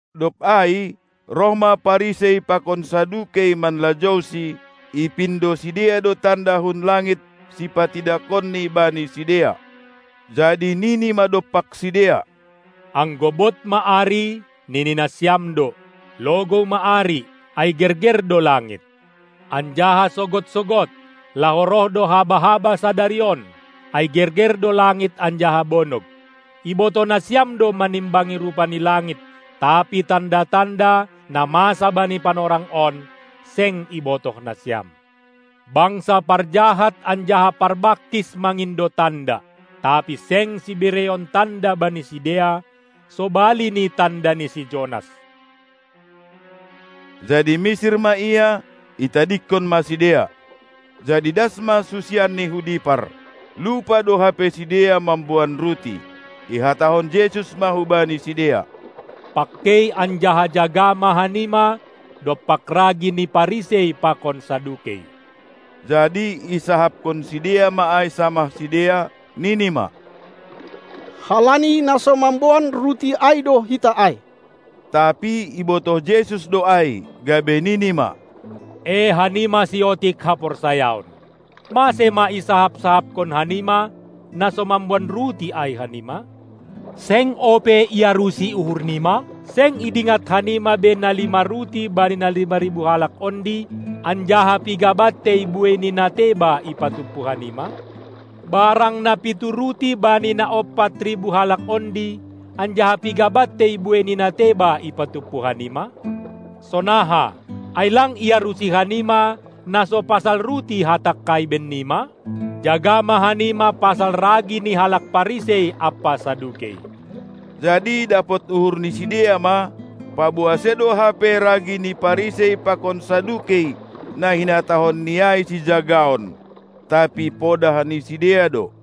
Dob ai roh ma Parisei pakon Sadukei manlajouSi; ipindo sidea do tanda hun langit sipatidakonNi bani sidea. Jadi nini ma dompak sidea: Anggo bod ma ari, nini nasiam do: Logou ma ari, ai gerger do langit. Anjaha sogod-sogod: Laho roh do haba-haba sadari on, ai gerger do langit anjaha bonog. Ibotoh nasiam do manimbangi rupa ni langit, tapi tanda-tanda, na masa bani panorang on, seng ibotoh nasiam. Bangsa parjahat anjaha parbangkis mangindo tanda; tapi seng sibereon tanda bani sidea, sobali ni tanda ni si Jonas. Jadi misir ma Ia, itadingkon ma sidea. Jadi das ma susianNi hu dipar, lupa do hape sidea mamboan ruti. Ihatahon Jesus ma hubani sidea: Pangkei anjaha jaga ma hanima dompak ragi ni Parisei pakon Sadukei. Jadi isahapkon sidea ma ai samah sidea, nini ma: Halani na so mamboan ruti ai do hita ai! Tapi ibotoh Jesus do ai, gabe nini ma: E hanima siotik haporsayaon! Mase ma isahap-sahapkon hanima na so mamboan ruti ai hanima? Seng ope iarusi uhurnima? Seng idingat hanima be na lima ruti bani na lima ribu halak ondi, anjaha piga bantei buei ni na teba ipatumpu hanima? Barang na pitu ruti bani na ompat ribu halak ondi, anjaha piga bantei buei ni na teba ipatumpu hanima? Sonaha, ai lang iarusi hanima, na so pasal ruti Hatangkai bennima? Jaga ma hanima pasal ragi ni halak Parisei ampa Sadukei! Jadi dapot uhur ni sidea ma, paboa sedo hape ragi ni Parisei pakon Sadukei na hinatahonni ai sijagaon, tapi podah ni sidea do.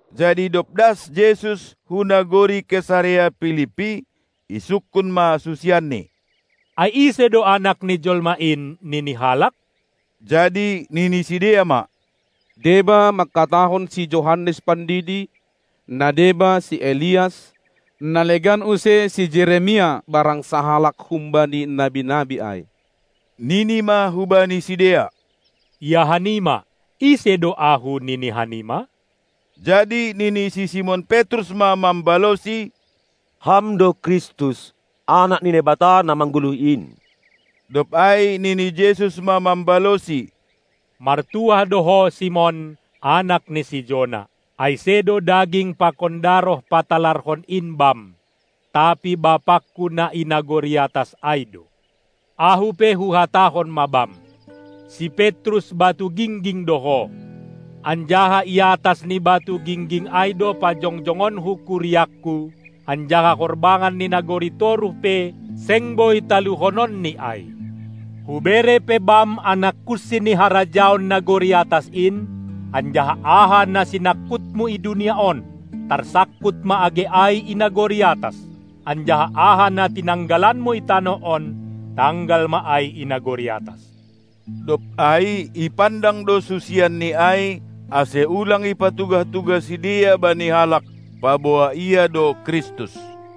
Jadi dob das Jesus hu nagori Kesarea Pilippi, isungkun ma susianNi: Ai ise do Anak ni jolma in, nini halak? Jadi nini sidea ma: Deba mangkatahon si Johannes Pandidi, na deba si Elias, na legan use si Jeremias barang sahalak humbani nabi-nabi ai. Nini ma hubani sidea: Ia hanima. Ise do Ahu, nini hanima? Jadi nini si Simon Petrus ma mambalosi! Ham do Kristus, Anak ni Naibata na manggoluh in! Dob ai nini Jesus ma mambalosi: Martuah do ho, Simon, anak ni si Jona, ai sedo daging pakon daroh patalarhon in bam, tapi BapangKu na i nagori atas ai do. Ahu pe Huhatahon ma bam: Si Petrus (batu gingging) do ho, anjaha i atas ni batu gingging ai do pajongjongonKu kuriangKu, anjaha horbangan ni nagori toruh pe seng boi taluhononni ai. Hubere pe bam anak kunsi ni harajaon nagori atas in, anjaha aha na sinangkutmu i dunia on, tarsangkut ma age ai i nagori atas, anjaha aha na tinanggalanmu i tanoh on, tanggal ma ai i nagori atas. Dob ai ipandang do susianNi ai, ase ulang ipatugah-tugah sidea bani halak, paboa Ia do Kristus.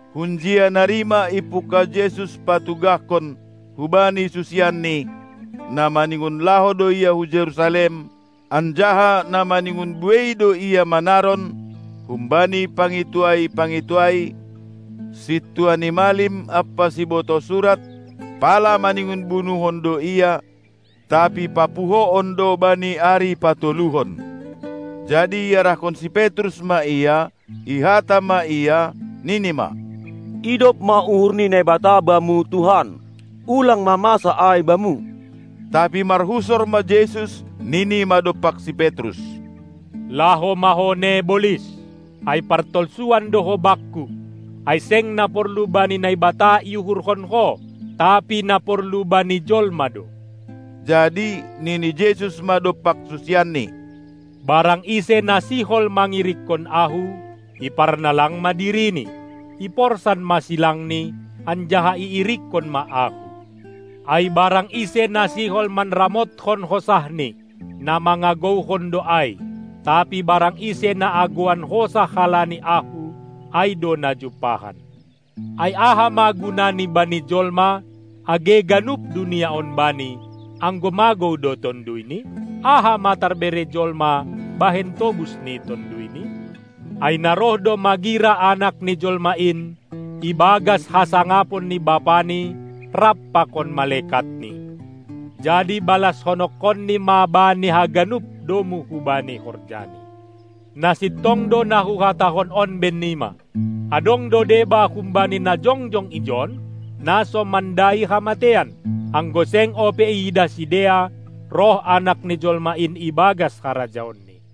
Hunjia nari ma ipungkah Jesus patugahkon hubani susianNi, na maningon laho do Ia hu Jerusalem, anjaha na maningon buei do Ia manaron humbani pangintuai-pangintuai, sintua ni malim ampa sibotoh surat, pala maningon bunuhon do Ia, tapi papuhoon do bani ari patoluhon. Jadi iarahkon si Petrus ma Ia, ihata ma Ia, nini ma: Idop ma uhur ni Naibata Bamu, Tuhan! Ulang ma masa ai Bamu! Tapi marhusor ma Jesus, nini ma dompak si Petrus: Laho ma ho ne, bolis! Ai partolsuan do ho Bakku, ai seng na porlu bani Naibata iuhurhon ho, tapi na porlu bani jolma do. Jadi nini Jesus ma dompak susianNi: Barang ise na sihol mangirikkon Ahu, iparnalang ma dirini, iporsan ma silangni, anjaha iirikkon ma Ahu! Ai barang ise na sihol manramotkon hosahni, na mangagouhon do ai, tapi barang ise na agouan hosah halani Ahu, ai do na jumpahan. Ai aha ma gunani bani jolma, age ganup dunia on bani, anggo magou do tonduyni? Aha ma tarbere jolma bahen tobus ni tonduyni? Ai na roh do magira Anak ni Jolma in ibagas hasangapon ni BapaNi rap pakon malekatNi, jadi balashononkonNi ma bani haganup domu hubani horjani. Na sintong do na Huhatahon on bennima: Adong do deba humbani na jongjong ijon, na so mandai hamateian, anggo seng ope iidah sidea roh Anak ni jolma in ibagas harajaonNi.